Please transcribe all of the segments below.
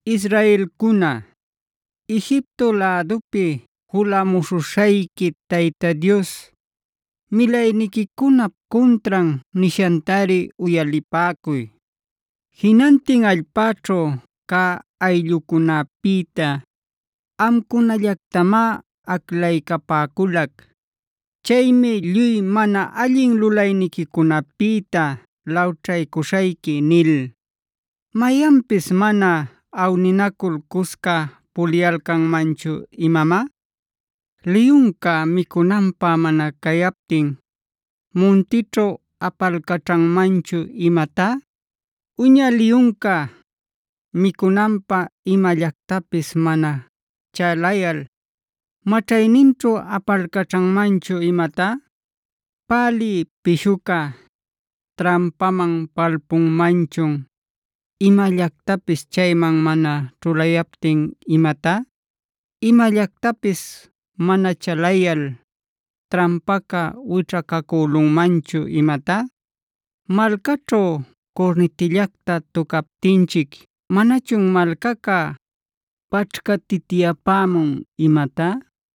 Israelcuna, Egipto lädupi julamuśhuśhayqui Tayta Dios milayniquicunap cuntran nishantari uyalipäcuy: “Jinantin allpäćhu cä ayllucunäpïta amcunallactamá aclaycapäculac.a Chaymi lluy mana allin lulayniquicunapïta lawćhaycuśhayqui” nil. ¿Mayanpis mana awninacul, cusca puliyalcanmanchu imamá? ¿Liyunca micunanpä mana cayaptin muntićhu apalcaćhanmanchun imatá? ¿Uña liyunca micunanpä imallactapis mana chalayal maćhayninćhu apalcaćhanmanchun imatá? ¿Pälï pishuca trampaman palpunmanchun imallactapis chayman mana ćhulayaptin imatá? ¿Imallactapis mana chalayal trampaca wićhacacülunmanchun imatá? ¿Malcaćhu curnitillacta tucaptinchic manachun malcaca paćhcatityapämun imatá?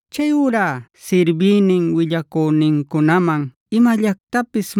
Chayurá sirbïnin willacünincunaman imallactapis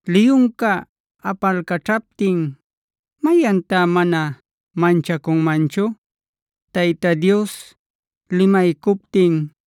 Liyunca apalcaćhaptin, ¿mayantá mana manchacunmanchu? Tayta Dios limaycuptin,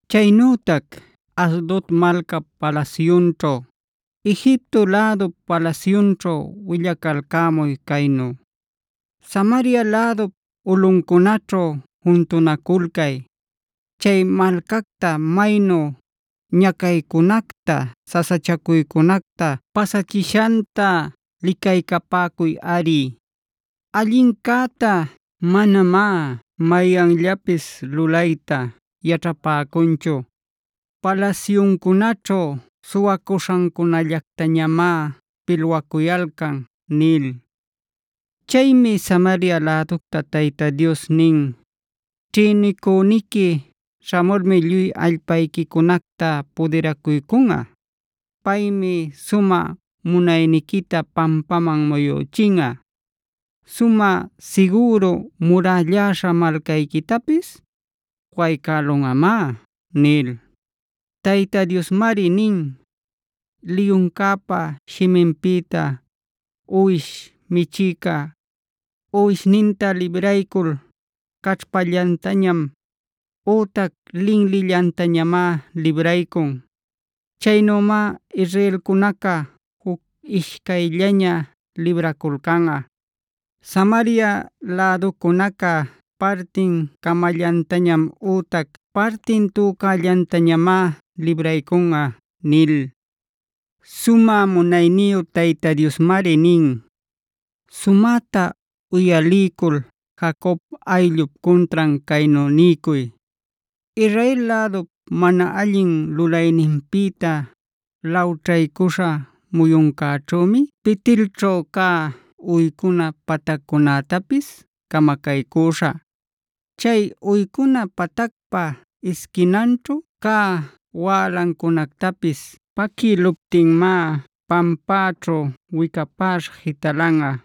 Chaynütac Asdod malcap palasyunćhu, Egipto lädup palasyunćhu willacalcämuy caynu: “Samaria lädup ulꞌuncunaćhu juntunaculcay. Chay malcacta maynu ñacaycunacta, sasachacuycunacta pasachishanta licaycapäcuyꞌari. Allincäta manamá mayanllapis lulayta yaćhapäcunchu. Palasyuncunaćhu suwacuśhancunallactamá pilwacuyalcan” nil. Chaymi Samaria läducta Tayta Dios nin: “Ćhïnicüniqui śhamulmi lluy allpayquicunacta pudiracuycunꞌa. Paymi sumä munayniquita pampaman muyüchinꞌa; sumä sigüru murälläśha malcayquitapis waycälunꞌamá” nil. Tayta Diosmari nin: “Liyuncäpa shiminpïta uwish michïca uwishninta libraycul caćhpallantañam ütac linlillantañamá libraycun. Chaynümá israelcunaca juc ishcayllaña libraculcanꞌa; Samaria läducunaca partin cämallantañam ütac partin täcunallantañamá libraycunꞌa” nil. Sumä munayniyu Tayta Diosmari nin: “Sumäta uyaliycul Jacob ayllup cuntran caynu niycuy: ‘Israel lädup mana allin lulayninpïta lawćhaycuśhá muyuncäćhümi Bet-elćhu cä uycuna pataccunätapis camacaycüśhä.e Chay uycuna patacpa isquinanćhu cä wälancunactapis paquïluptinmá pampäćhu wicapäśha jitalanꞌa.